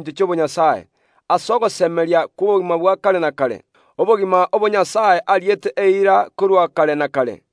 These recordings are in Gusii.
ekio keigekire ase ogosemeria kw’obogima bwa kare na kare. Obogima obo Nyasae ariete eira korwa kare na kare.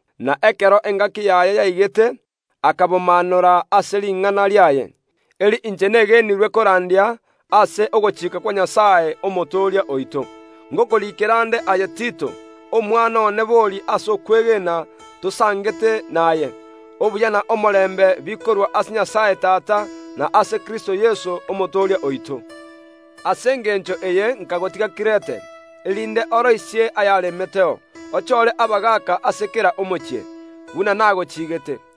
Na ekero engaki yaye yaigete akabomaanora ase ring’ana riaye, eri inche negenirwe korandia ase ogochika kwa Nyasae, Omotooria oito. Ngokoriikera nde aye Tito, omwana one bori ase okwegena tosangete naye: Obuya na omorembe bikorwa ase Nyasae Tata, na ase Kristo Yeso, Omotooria oito. Nkagotiga Kirete, erinde oroisie aria aganetie gokorwa erio ochore abagaaka ime ase kera omochie. Inyora buna nagochigeete.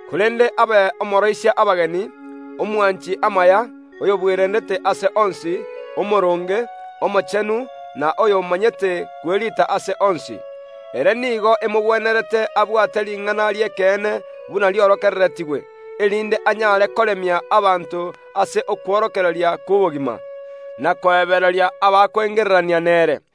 Korende abe omooroisia abageni, oyobwanchete amaya, oyobwerendete ase onsi, omooronge, omochenu, na oy’omanyete kweriita ase onsi. Ere nigo emogwenerete abwate ring’ana ri’ekeene buna riorokereretigwe, erinde anyare koremia abanto ase okworokereria gw’ekeene, na korongeyia abakoengererania nario.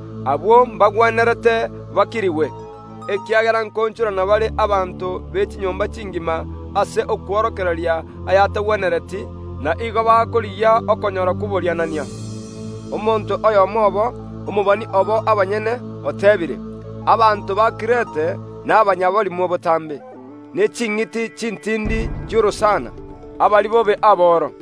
Abwo mbagwenerete bakirigwe, ekiagera nkoonchorana bare abanto b’echinyomba chingima ase okworokereria aya’atagwenereti, naende ase obosooku, barabwo nigo bakorigia kwenyorera chitaabu. Omonto oyomo obo Omokirete, omobani obo abanyene, oteebire, “Abanto ba Kirete nabanyaborimo botambe, ne ching’iti chintindi chi’orosana, abaribobe aboro.”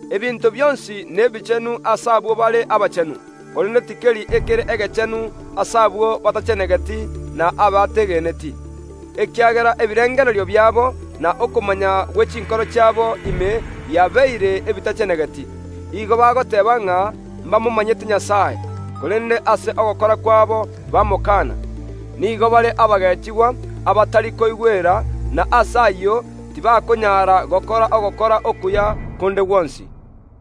Ebinto bionsi nebichenu ase abwo bare abachenu, korende tikeri ekere egechenu ase abwo batachenegeti na abategeneti, ekiagera ebirengererio biabo na okomanya gwe chinkoro chiabo ime biabeire ebitachenegeti. Barabwo nigo bagoteeba ng’a mbamomanyete Nyasae, korende ase ogokora kwabo bagekaana. Nigo bare abokogeechia, abatari koigwera, na ase ayio tibakonyaara gokora ogokora konde gwonsi okuya.